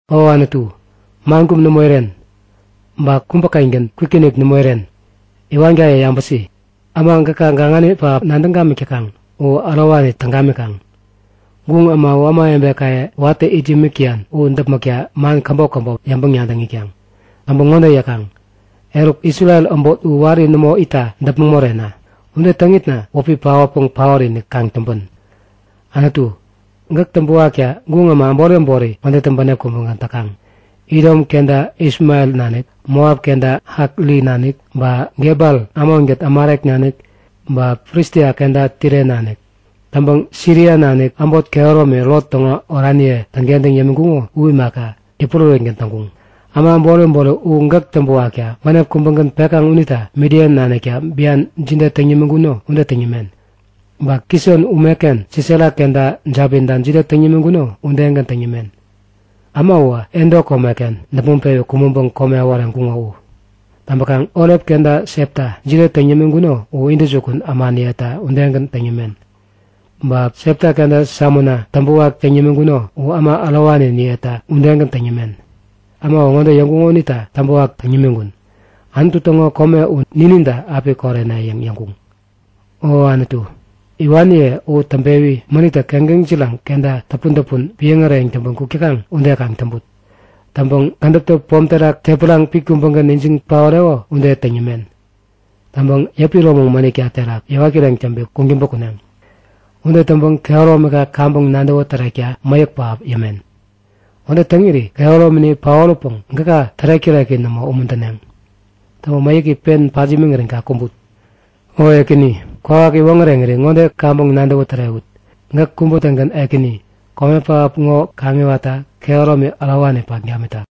O Anutu, man kum nämo iren. Ba kubäkengän kwikinik nämo iren. Iwankaye yabäsi! Äma gäka gaŋani pähap nadäŋ gamik täkaŋ u ärowani täŋ gamikaŋ. Guŋ äma u ämawebekaye watä it yämik täyan u däpmäkta man käbop käbop yäŋpäŋ-nadäŋ itkaŋ. Täŋpäŋ ŋode yäkaŋ; Eruk, Isrel äbot u wari nämo itta däpmäŋ morena. Ude täŋitna wäpi paotpäŋ paot-inik kaŋ täŋpän. Anutu, gäk täŋpäwakta guŋ äma äbori äbori ŋodetä bänep kubägän täkaŋ; Idom kenta Ismael nanik, Moap kenta Hakri nanik, ba Gebal, Amonkät Amalek nanik, ba Filistia kenta Tire nanik. Täŋpäŋ Siria nanik, äbot kehäromi Lot täŋo oraniye täŋkentäŋ yämiŋkuŋo u imaka, yäpurärätgän täŋkuŋ. Äma äbori äbori u gäk täŋpäwakta bänep kubägän pekaŋ unita Midian nanikta bian jide täŋ yämiŋkuno ude täŋ yämen. Ba Kison umeken Sisera kenta Jabinta jide täŋ yämiŋkuno udegän täŋ yämen. Äma uwä Endo komeken däpmäŋ-pewi kumäŋpäŋ kome äworeŋkuŋo u. Täŋpäkaŋ Orep kenta Septa jide täŋ yämiŋkuno u intäjukun ämaniyeta udegän täŋ yämen. Ba Sepa kenta Salmuna täŋpäwak täŋ yämiŋkuno u äma ärowaniniyeta udegän täŋ yämen. Äma uwä ŋode yäŋkuŋo unita täŋpäwak täŋ yämiŋkun; Anutu täŋo kome u nininta api korene yäŋ yäŋkuŋ. O Anutu, iwaniye u täŋpewi mänittä keŋkeŋ jiraŋ kenta täpun-täpun piäŋ äreyäŋ täŋpän kuk täkaŋ ude kaŋ täŋput. Täŋpäŋ kädäptä pom terak tepäraŋ pit kubägän ijiŋ paoreko ude täŋ yämen. Täŋpäŋ yäpä iromäŋ mänitka terak yäwat kireŋ täŋpi kuŋtäŋpä kuneŋ. Ude täŋpäŋ kehäromika kaŋpäŋ nadäwä tärekta mäyäk pähap yämen. Ude täŋiri kehäromini paoräpäŋ gäka tärek-täreki nämo umuntäneŋ. Täŋpäŋ mäyäki pen pat yämiŋirän kaŋ kumbut. O Ekäni, kwawak yäwoŋäreŋiri ŋode kaŋpäŋ nadäwä tärewut; Gäk kubä-tägän Ekäni, kome pähap ŋo kaŋiwatta kehäromi ärowani pat gamitak.